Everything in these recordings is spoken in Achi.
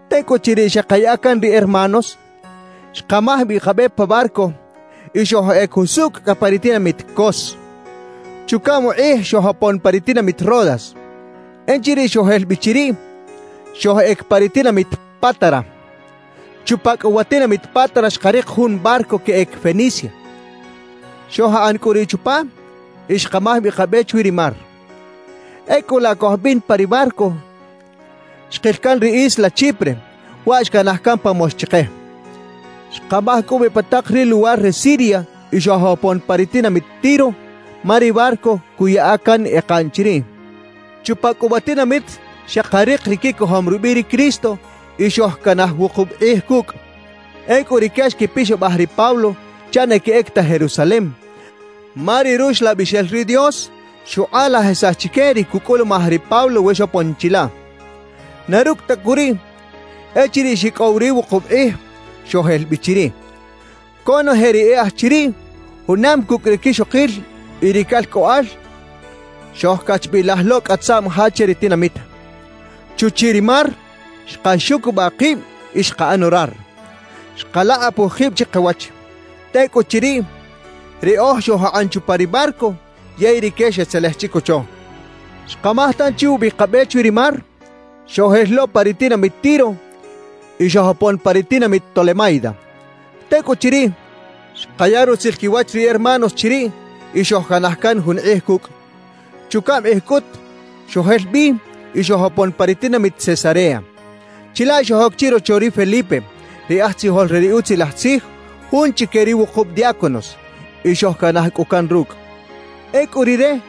Tecꞌuchiriꞌ xekaya can ri hermanos, xkamaj bi kabe pa barco y xojꞌec jusucꞌ cꞌa pa ri tinamit Cos. Chucaꞌm kꞌij xojopon pa ri tinamit Rodas. Echiriꞌ xojel bi chiriꞌ, xojꞌec pa ri tinamit Pátara. Chupa cꞌu wa tinamit Pátara xkarik jun barco queꞌec Fenicia. Xojakꞌan cꞌu riꞌ chupa y xkamaj bi kabe chwi ri mar. Ecꞌu laꞌ cojbin pa ri barco, xkil can ri isla Chipre, waꞌ xcanaj can pa mox chike. Xkamaj cꞌu bi pa tak ri luwar re Siria y xojopon pa ri tinamit Tiro, ma ri barco cuꞌyaꞌa can ekaꞌn chiriꞌ. Chupa cꞌu wa tinamit xekarik ri quicojom rubiꞌ ri Cristo y xojcanaj wukub kꞌij cucꞌ. Ecꞌu rique xquipixabaj ri Pablo chaꞌ na queꞌec ta Jerusalem, ma ri Ruxlabixel ri Dios xukꞌalajisaj chique ri cucꞌulumaj ri Pablo we xopon chilaꞌ. Na rucꞌ ta cꞌu riꞌ, echiriꞌ xicꞌow ri wukub kꞌij, xojel bi chiriꞌ. Conoje ri e aj chiriꞌ, junam cucꞌ ri quixokil y ri calcꞌoꞌal, xojcachbilaj lo cꞌa tzaꞌm ja che ri tinamit. Chuchiꞌ ri mar xkaxucubaꞌ kib y xkaꞌan orar. Xkalakꞌapuj kib chikawach. Tecꞌuchiriꞌ, riꞌoj xojakꞌan chupa ri barco, yey rique xetzelej chicocho. Xkamaj tanchi ubi kabe chwi ri mar; xojel lo pa ri tinamit Tiro y xojopon pa ri tinamit Tolemaida. Tecꞌuchiriꞌ, xkaya rutzil quiwach ri hermanos chiriꞌ y xojcanaj can jun kꞌij cucꞌ. Chucaꞌm kꞌij cꞌut, xojel bi y xojopon pa ri tinamit Cesarea. Chilaꞌ xojoc chirocho ri Felipe, ri aj tzijol re ri Utzilaj Tzij, jun chique ri wukub diáconos. Y xojcanaj cꞌu can rucꞌ. Ecꞌu rire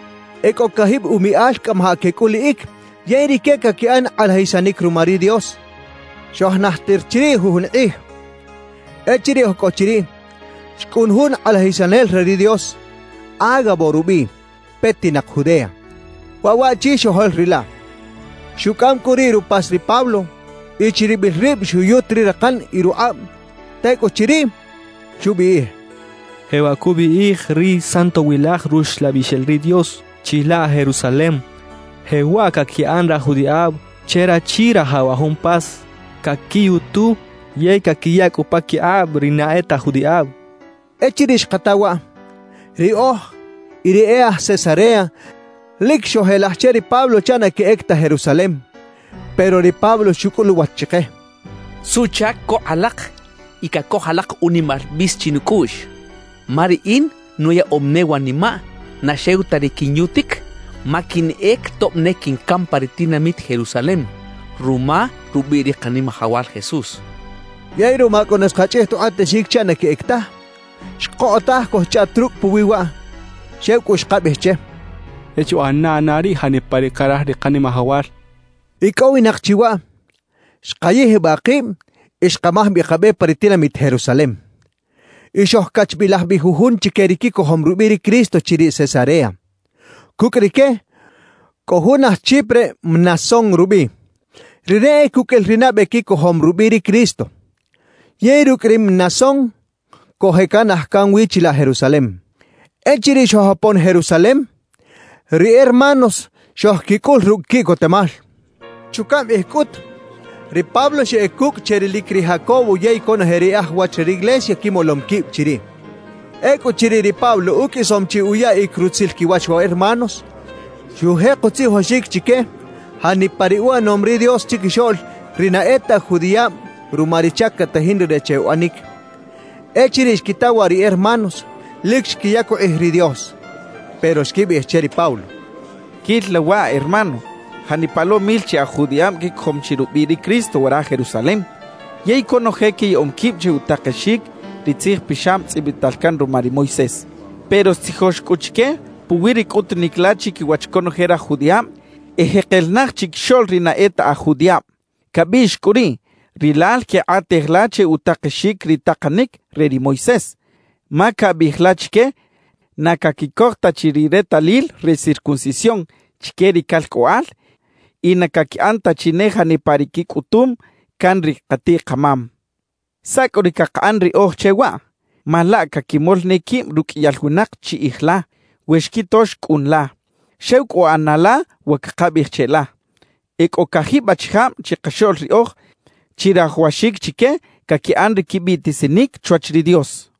e cꞌo cajib umiꞌal cꞌamajaꞌ quecꞌuliꞌic yey rique caquiꞌan kꞌalajisanic ruma ri Dios. Xojnajtir chiriꞌ jujun kꞌij. Echiriꞌ oj cꞌo chiriꞌ, xcꞌun jun kꞌalajisanel re ri Dios, Ágabo rubiꞌ, petinak Judea. Waꞌ waꞌchi xojoꞌlrilaꞌ. Xucꞌam cꞌu riꞌ rupas ri Pablo y chiribil rib xuyut ri rakan y rukꞌab; tecꞌuchiriꞌ, xubiꞌij: —Jewaꞌ cubiꞌij ri Santowilaj Ruxlabixel ri Dios: “Chilaꞌ Jerusalem, jewaꞌ caquiꞌan raj judiꞌab che rachi rajaw wa jun pas, caquiyutu yey caquiya cꞌu paquikꞌab ri na e ta aj judiꞌab” —xchaꞌ. Echiriꞌ xkata waꞌ, riꞌoj y ri e aj Cesarea lic xojelaj che ri Pablo chaꞌ na queꞌec ta Jerusalem. Pero ri Pablo xucꞌul uwach chike: —¿Suꞌchac cokꞌ alak y cacoj alak unimal bis chinucꞌuꞌx? Ma riꞌin nuyaꞌom ne wanimaꞌ na xew ta ri quinyutic, ma quinꞌec tob ne quincam pa ri tinamit Jerusalem ruma rubiꞌ ri Kanimajawal Jesús —xchaꞌ. Yey ruma cꞌu na xkachꞌij ta ukꞌatexic chaꞌ na queꞌec taj, xkokꞌotaj cojchꞌaꞌt rucꞌ puwi waꞌ, xew cꞌu xkabiꞌij che: —E chuꞌana na riꞌ janipa ri caraj ri Kanimajawal —xojchaꞌ. Icꞌowinak chi waꞌ, xkayijbaꞌ kib y xkamaj bi kabe pa ri tinamit Jerusalem. Y xojcachbilaj bi jujun chique ri quicojom rubiꞌ ri Cristo chiriꞌ Cesarea. Cucꞌ rique cꞌo jun aj Chipre Mnasón rubiꞌ. Rire e cuqꞌuil ri nabe quicojom rubiꞌ ri Cristo. Yey rucꞌ ri Mnasón cojeꞌcanaj can wi chilaꞌ Jerusalem. Echiriꞌ xojopon Jerusalem, ri hermanos xojquicꞌul rucꞌ quiꞌcotemal. Chucaꞌm kꞌij cꞌut, ri Pablo xeꞌec kucꞌ che rilic ri Jacobo yey conoje ri e aj wach re riglesia quimolom quib chiriꞌ. Ecꞌuchiriꞌ ri Pablo uqꞌuisom chi uyaꞌic rutzil quiwach wa hermanos, xujek utzijoxic chique janipa ri uꞌanom ri Dios chiquixoꞌl ri na e ta aj judiꞌab ruma ri chac catajin rire che uꞌanic. Echiriꞌ xquita waꞌ ri hermanos, lic xquiyac ukꞌij ri Dios. Pero xquibiꞌij che ri Pablo: «Quil la waꞌ, hermano, janipa lo mil chi aj judiꞌab quicojom chi rubiꞌ ri Cristo wara Jerusalem; yey conoje quiyaꞌom quib che utakexic ri Tzij Pixab tzꞌibital can ruma ri Moisés. Pero xtzijox cꞌu chique puwi ri cꞌutunic la chiquiwach conoje raj judiꞌab ejekel naj chiquixoꞌl ri na e ta aj judiꞌab. Cabiꞌx cꞌu riꞌ rilal quekꞌatej la che utakexic ri takanic re ri Moisés, ma cabiꞌij la chique na caquicoj ta chi ri retalil re circuncisión chique ri calcꞌoꞌal y na caquiꞌan ta chi ne janipa ri quicꞌutum can ri katiꞌ-kamam. »¿Saꞌ cꞌu ri cakaꞌan riꞌoj che waꞌ? Ma laꞌ caquimol ne quib ruqꞌuiyal winak chiꞌij la, we xquito xcꞌun la. »Xew cꞌu ꞌana la wa cakabiꞌij cheꞌla: E cꞌo cajib achijab chikaxoꞌl riꞌoj, chirajawaxic chique caquiꞌan ri quibiꞌtisinic chwach ri Dios.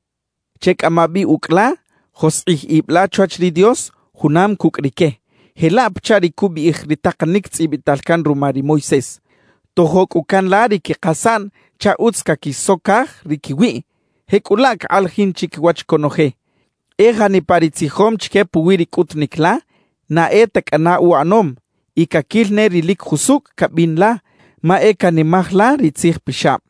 Checꞌama bi ucꞌ la, joskꞌij ib la chwach ri Dios junam cucꞌ rique, jelaꞌ pachaꞌ ri cubiꞌij ri takanic tzꞌibital can ruma ri Moisés. Tojo cꞌu can la ri quikasaꞌn chaꞌ utz caquisocaj ri quiwiꞌ. Jecꞌulaꞌ cakꞌalajin chiquiwach conoje: E janipa ri tzijom chique puwi ri cꞌutunic la, na e ta cꞌana uꞌanom; y caquil ne ri lic jusucꞌ cabin la, ma e canimaj la ri Tzij Pixab.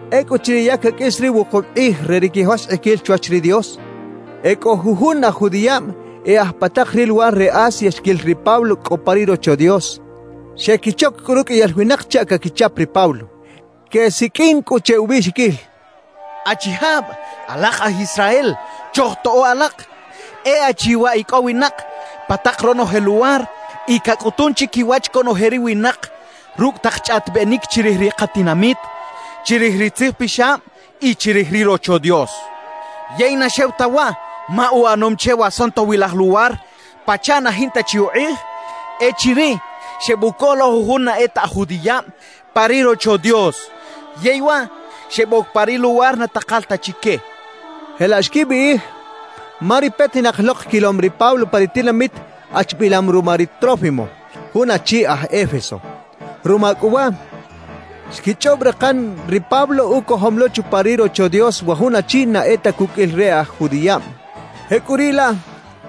Ecꞌuchiriꞌ ya caqꞌuis ri wukub kꞌij re ri quijoskꞌiquil chwach ri Dios, e cꞌo jujun aj judiꞌab e aj pa tak ri luwar re Asia xquil ri Pablo cꞌo pa ri Rocho Dios. Xequichoc cꞌu ruqꞌuiyal winak chaꞌ caquichap ri Pablo. Quesiqꞌuin cꞌu che ubiꞌxiquil: «¡Achijab alak aj Israel, chojtoꞌo alak! E achi waꞌ icꞌowinak pa tak ronoje luwar y cacꞌutun chiquiwach conoje ri winak rucꞌ tak chꞌaꞌtibenic chirij ri katinamit, chirij ri Tzij Pixab y chirij ri Rocho Dios. Yey na xew ta waꞌ, ma uꞌanom che wa Santowilaj Luwar pachaꞌ na jinta chi ukꞌij echiriꞌ xebucoj lo jujun na e ta aj judiꞌab pa ri Rocho Dios, yey waꞌ xeboc pa ri luwar na takal ta chique» quechaꞌ. Jelaꞌ xquibiꞌij, ma ri petinak lok quilom ri Pablo pa ri tinamit achbilam ruma ri Trófimo, jun achi aj Éfeso. Ruma cꞌu waꞌ, xquichꞌob rakan ri Pablo ucojom lo chupa ri Rocho Dios wa jun achi na e ta cuqꞌuil ri e aj judiꞌab. Jecꞌuriꞌlaꞌ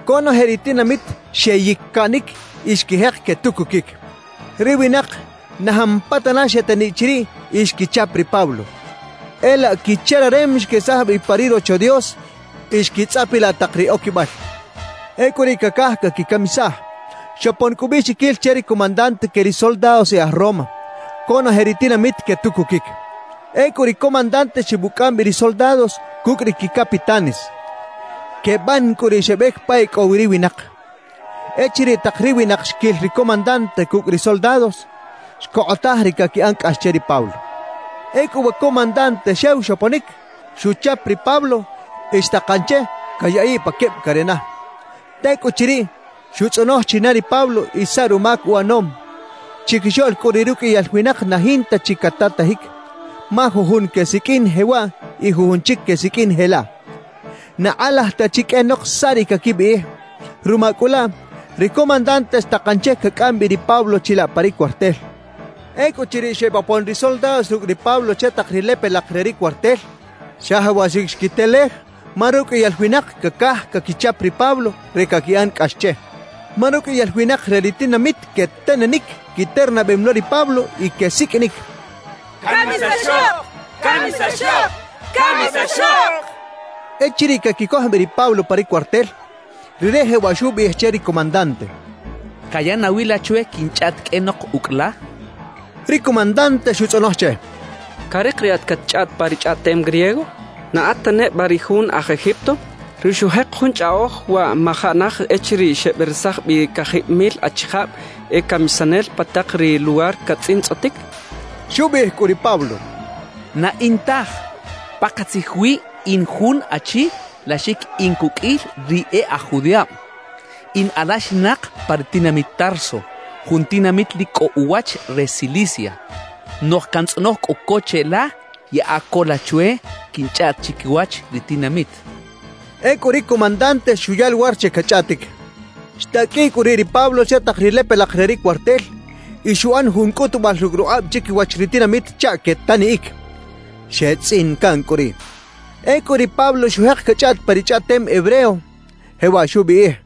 conoje ri tinamit xeyic-caꞌnic y xquijek quetucuquic. Ri winak na jampatana xeteniꞌ chiriꞌ y xquichap ri Pablo. E laꞌ quichararem xquesaj bi pa ri Rocho Dios y xquitzꞌapilaꞌ tak ri oquibal. Ecꞌu riꞌ cacaj caquicamisaj. Xopon cꞌu ubiꞌxiquil che ri comandante que ri soldados e aj Roma: «Conoje ri tinamit quetucuquic.» Ecꞌu ri comandante xebucꞌam bi ri soldados cucꞌ ri quicapitanes. Queban cꞌu riꞌ xebec pa e cꞌo wi ri winak. Echiriꞌ tak ri winak xquil ri comandante cucꞌ ri soldados, xcokꞌotaj ri caquiꞌan cꞌax che ri Pablo. Ecꞌu wa comandante xew xoponic, xuchap ri Pablo y xtakan che cayaꞌiꞌ pa queb carena. Tecꞌuchiriꞌ, xutzꞌonoj china ri Pablo y saꞌ rumac uꞌanom. Chiquixoꞌl cꞌu riꞌ ruqꞌuiyal winak na jinta chi catatajic, ma jujun quesiqꞌuin jewaꞌ y jujun chic quesiqꞌuin jelaꞌ. Na kꞌalaj ta chi qꞌuenok saꞌ ri caquibiꞌij. Ruma cꞌu laꞌ, ri comandante xtakan che cacꞌam bi ri Pablo chilaꞌ pa ri cuartel. Ecꞌuchiriꞌ xebopon ri soldados rucꞌ ri Pablo che tak ri lepelak re ri cuartel, xajawaxic xquitelej ma ruqꞌuiyal winak cacaj caquichap ri Pablo re caquiꞌan cꞌax che. Ma ruqꞌuiyal winak re ri tinamit quetenenic, quiternabem lo ri Pablo y quesiqꞌuinic: «¡Camisaxok! ¡Camisaxok!» quechaꞌ. Echiriꞌ caquicoj bi ri Pablo pa ri cuartel, rire jewaꞌ xubiꞌij che ri comandante: —¿Caya nawi la chwe quinchꞌaꞌt qꞌuenok ucꞌ la? —xchaꞌ. Ri comandante xutzꞌonoj che: —¿Carik riꞌat catchꞌaꞌt pa ri chꞌaꞌtem griego? ¿Na at ta neba ri jun aj Egipto, ri xujek jun chꞌaꞌoj wa majaꞌ naj echiriꞌ xeberesaj bi cajib mil achijab e camisanel pa tak ri luwar catzꞌintzꞌotic? —xcha che. Xubiꞌij cꞌu ri Pablo: —Na in taj. Pakatzij wi in jun achi laxic in cuqꞌuil ri e aj judiꞌab. In alaxinak pa ri tinamit Tarso, jun tinamit lic cꞌo uwach re Cilicia. Noꞌj cantzꞌonoj cꞌu co cheꞌla, yaꞌa co la chwe quinchꞌaꞌt chiquiwach ri tinamit —xchaꞌ. Ecꞌu ri comandante xuya luwar che cachꞌaꞌtic. Xtaqꞌuiꞌ cꞌu riꞌ ri Pablo che tak ri lepelak re ri cuartel y xuꞌan jun cꞌutubal rucꞌ rukꞌab chiquiwach ri tinamit chaꞌ quetaniꞌic. Xetzꞌin caꞌn cꞌu riꞌ. Ecꞌu ri Pablo xujek cachꞌaꞌt pa ri chꞌaꞌtem hebreo, jewaꞌ xubiꞌij: